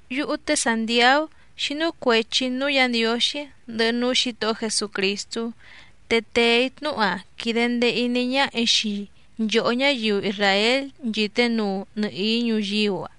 Yúhú té Sàntiaú xínú cuèchi‑í núú Yǎ Ndiǒxí ndɨhɨ núú Xǐtohó Jesucrìstú, te tèe‑í tnúhu‑a quìde ndee iní ñáhà‑í xii nchòhó ñáyiu isràél nchìté nuu nɨhìí ñuyíú‑a.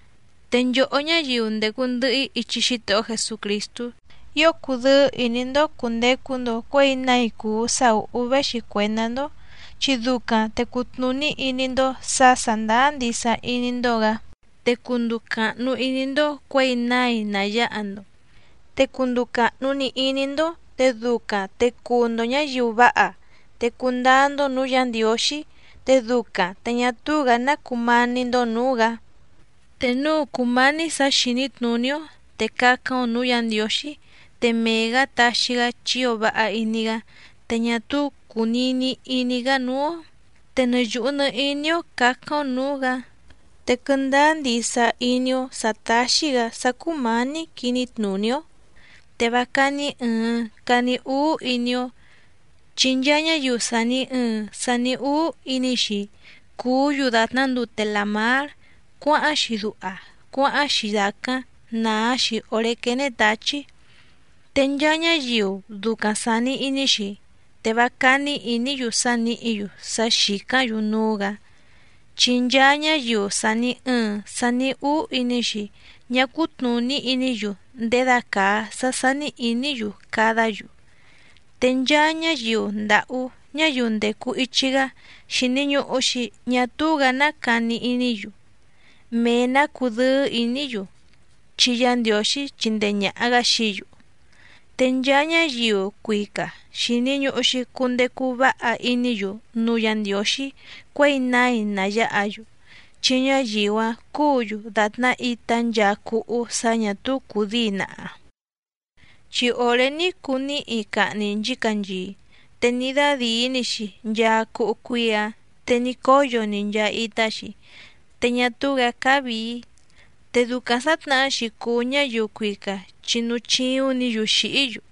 Te nchòhó ñáyiu ndècu ndɨhɨ‑í ichi Xítohó Jesucrìstú, ío cudɨ́ɨ́ ìní‑ndó cùndecu‑ndo cuéi nái cùu sá ùhú véxi cuèndá‑ndó, chi ducaⁿ te cutnùní iní‑ndó sǎ sàndáá ndisa iní‑ndó‑gǎ, te cunduu càhnu iní‑ndó cuěi nái ná yáha‑ndo. Te cunduu càhnu‑ni iní‑ndó te ducaⁿ te cuu‑ndo ñǎyiu váha, te cundáá‑ndó nǔú Yǎ Ndiǒxí, te ducaⁿ te ñá túú‑gǎ ná cumání‑ndó nǔú‑gǎ. Te núu cùmání sǎ xìní tnùní‑ó, te cácáⁿ‑ó nǔú Yǎ Ndiǒxí te mee‑gǎ taxi‑gá, chi ío váha iní‑gá, te ñá túú cùnini iní‑gá núú‑ó. Te nɨ yùhu nɨ iní‑ó cǎcáⁿ‑ó nǔú‑gǎ, te quɨndáá ndisa iní‑ó sǎ táxí‑gǎ sá cúmǎní quiní tnùní‑ó, te vá cání ɨ̀ɨⁿ cani úú iní‑ó. Chi nchaa ñáyiu sàni ɨɨⁿ sani úú iní‑xi cùú‑yu dàtná ndute làmár cuáháⁿ‑xi duha cuáháⁿ‑xi dàcáⁿ nàá‑xi òré quéné tǎchí. Te nchaa ñáyiu ducaⁿ sàni iní‑xi, te vá cání ìní‑yu sá nìhí‑yu sá xìcáⁿ‑yu núú‑gǎ. Chi nchaa ñáyiu sàni ɨɨⁿ sani úú iní‑xi ñá cútnùní iní‑yu ndědacàa sá sání ìní‑yu cadá‑yu. Te nchaa ñáyiu ndàhú ñáyiu ndècu ichi‑gá, xìni ñuhu‑xi ñá túú‑gǎ ná cani iní‑yu, mee‑nǎ cudɨ́ɨ́ ìní‑yu, chi Yá Ndiǒxí chíndèe ñaha‑gá xií‑yu. Te nchaa ñáyiu cuica xìni ñuhu‑xi cundecu váha iní‑yu núú Yǎ Ndiǒxí cuěi nái ná yáha‑yu. Chi ñáyiu‑áⁿ cúǔ‑yu dàtná itá nchaa cúhú sǎ ñà túú cùdíi naha. Chi òré ní cuu níhi cahni nchícanchii, te ní dádìí‑ni‑xi nchaa cúhú cuíí‑ǎⁿ te ní cóyo‑ni nchaa itá‑xi, te ñá túú‑gǎ cáá vìi. Te ducaⁿ sǎtnahá‑xi cùu ñáyiu cuica chi núú chíúⁿ‑nǐ‑yu xìhí‑yu.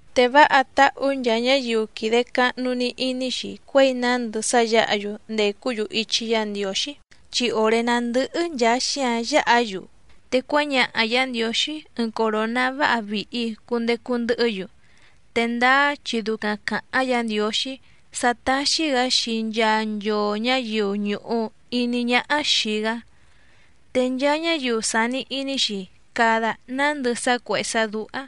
Te váha táhú nchaa ñáyiu quìde cahnu‑ni iní‑xi cuěi nándɨ sá yǎha‑yu ndècú‑yu ichi Yá Ndiǒxí, chi òré ná ndɨ́hɨ́ nchàa xíǎⁿ yǎha‑yu, te cuáñaha Yǎ Ndiǒxí ɨɨⁿ coròná váha vìhi cundecu ndɨhɨ́‑yu, te ndáá chi ducaⁿ càháⁿ Yǎ Ndiǒxí sá táxí‑gǎ xii nchaa nchoo ñǎyiu ñùhu iní ñáhá xìi‑gá. Te nchaa ñáyiu sàni iní‑xi cada nándɨ sá cuèhé sá dúhá,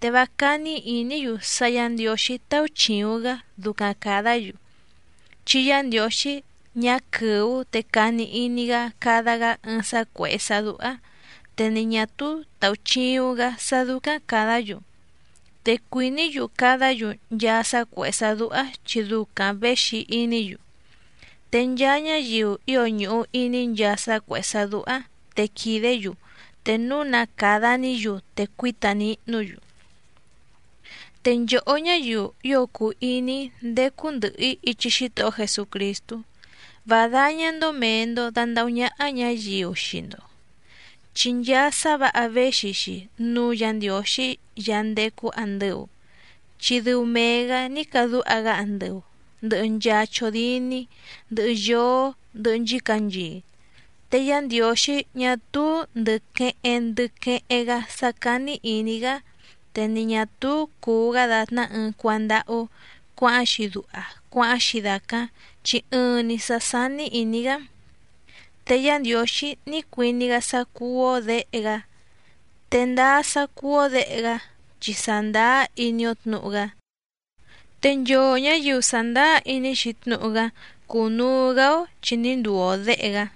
te vá cání ìní‑yu sá Yǎ Ndiǒxí táúchìuⁿ‑gá ducaⁿ càdá‑yu, chi Yá Ndiǒxí ñá quɨ̀ú te cani iní‑gá cada‑gá ɨɨⁿ sá cuèhé sá dúhá, te ni ñà túú tàuchiuⁿ‑gá sá dúcáⁿ càdá‑yu. Te cuìní‑yu cadá‑yu nchaa sá cuèhé sá dúhá chi ducaⁿ věxi iní‑yu. Te nchaa ñáyiu ío ñùhu iní nchaa sá cuèhé sá dúhá te quìdé‑yu, te núu na càda‑ní‑yu te cuíta nihnú‑yu. Te nchòhó ñáyiu ío cùu iní‑í ndécú ndɨ̀hɨ‑í ichi Xítohó Jesucrìstú, vá dáñá‑ndó mèe‑ndo dandahú ñáhá ñǎyiu xii‑ndo. Chi nchaa sá vǎha véxi‑xi núú Yǎ Ndiǒxí Yaá ndécú àndɨu, chi dɨu mee‑gǎ ní cadúha‑gá andɨu ndɨ̀hɨ nchaa chódíní, ndɨhɨ yóó, ndɨhɨ nchícanchii. Te Yá Ndiǒxí ñá túú ndɨ̀ queheⁿ ndɨ queheⁿ‑gá sá cání ìní‑gá, te ni ñà túú cùu‑gá dàtná ɨɨⁿ cuándáhú cuǎháⁿ‑xi duha cuáháⁿ‑xi dàcáⁿ, chi ɨɨⁿ‑ni sǎ sání ìní‑gá. Te Yá Ndiǒxí ní cuiní‑gá sá cúú‑ó děhe‑gá, te ndáá sá cúú‑ó děhe‑gá chi sàndáá iní‑ó tnǔhu‑gá. Te nchoo ñǎyiu sàndáá iní‑xi tnúhu‑gá cúnùu‑gá‑ó chi ní nduu‑o děhe‑gá.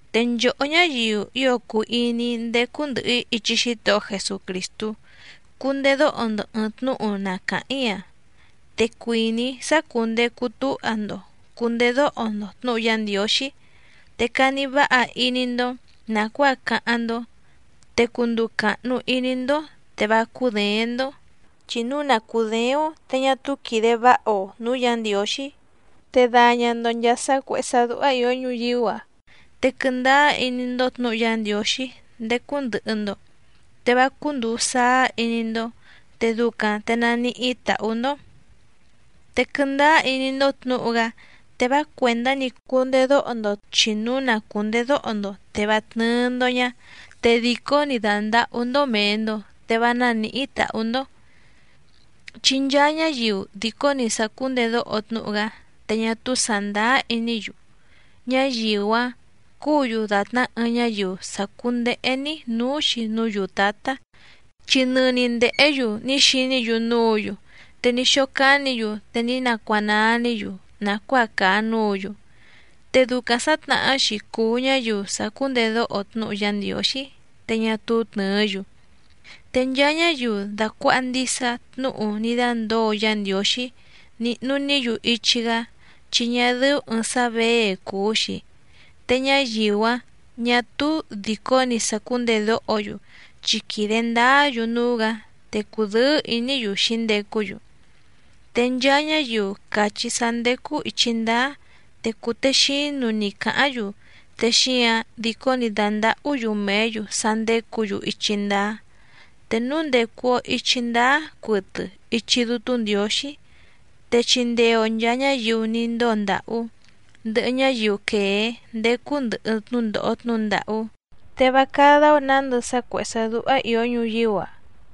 Te nchòhó ñáyiu ío cùu iní‑í ndécú ndɨ̀hɨ‑í ichi Xítohó Jesucrìstú, cundedóho‑ndo ɨ̀ɨⁿ tnúhu na càháⁿ‑í‑a. Te cuìní‑í sá cùndecu túha‑ndo cùndedóho‑ndo tnǔhu Yá Ndiǒxí, te cani váha iní‑ndó nàcuáa cáháⁿ‑ndó, te cunduu càhnu iní‑ndó te vá cúděéⁿ‑ndó. Chi núu na cùdééⁿ‑ó te ñá túú quìde váha‑o nǔú Yǎ Ndiǒxí. Te daña‑ndo nchàa sá cuèhé sá dúhá ìó ñuyíú‑a. Te quɨndáá iní‑ndó tnǔhu Yá Ndiǒxí ndécú ndɨ̀hɨ‑ndo, te vá cúndùu sáá iní‑ndó, te ducaⁿ te naníhí tàhú‑ndó. Te quɨndáá iní‑ndó tnǔhu‑gá te vá cuèndá‑ni cundedóho‑ndo, chi núu na cùndedóho‑ndo te vá tnɨ́ɨ́‑ndó ñá, te dìcó‑ni dàndahú‑ndó mèe‑ndo te vá nánìhí tàhú‑ndó. Chi nchaa ñáyiu dìcó‑ni sàcúndedóho tnúhu‑gá te ñá túú sàndáá iní‑yu, ñáyiu‑áⁿ cúǔ‑yu dàtná ɨɨⁿ ñáyiu sàcúndéhé‑ní nǔú‑xi núú yùtátá. Chi nɨni ndèhé‑yu ní xiní‑yu núǔ‑yu, te ní xócánǐ‑yu te ní nacuanaa‑ní‑yu nàcuáa càa núǔ‑yu. Te ducaⁿ sǎtnahá‑xi cùu ñáyiu sàcúndedóho tnúhu Yá Ndiǒxí, te ñá túú tnɨ̀ɨ́‑yu. Te nchaa ñáyiu dàcuaha ndisa tnúhu ní dándǒo Yá Ndiǒxí nìhnu‑ní‑yu ichi‑gá, chi ñá dɨ́ú ɨ̀ɨⁿ sá věe cùu‑xi. Te ñáyiu‑áⁿ ñà túú dìcó‑ni sàcúndedóho‑yu chi quìde ndáá‑yu núú‑gǎ, te cùdɨ́ɨ́ ìní‑yu xǐndecú‑yu. Te nchaa ñáyiu càchí sá ndécú ìchi ndáá te cùtexínu‑ni càháⁿ‑yu, te xíǎⁿ dìcó‑ni dàndahú‑yu mèé‑yu sá ndécǔ‑yu ichi ndáá. Te núu ndècu‑o ichi ndáá cuɨtɨ ichi Dútú Ndiǒxí, te chindee‑o nchàa ñáyiu ní ndóo ndàhú, ndɨhɨ ñáyiu quèé ndécú ndɨ̀hɨ tnúndòho tnúhu ndàhú, te vá cádá‑ó nǎndɨ sá cuèhé sá dúhá ìó ñuyíú‑a.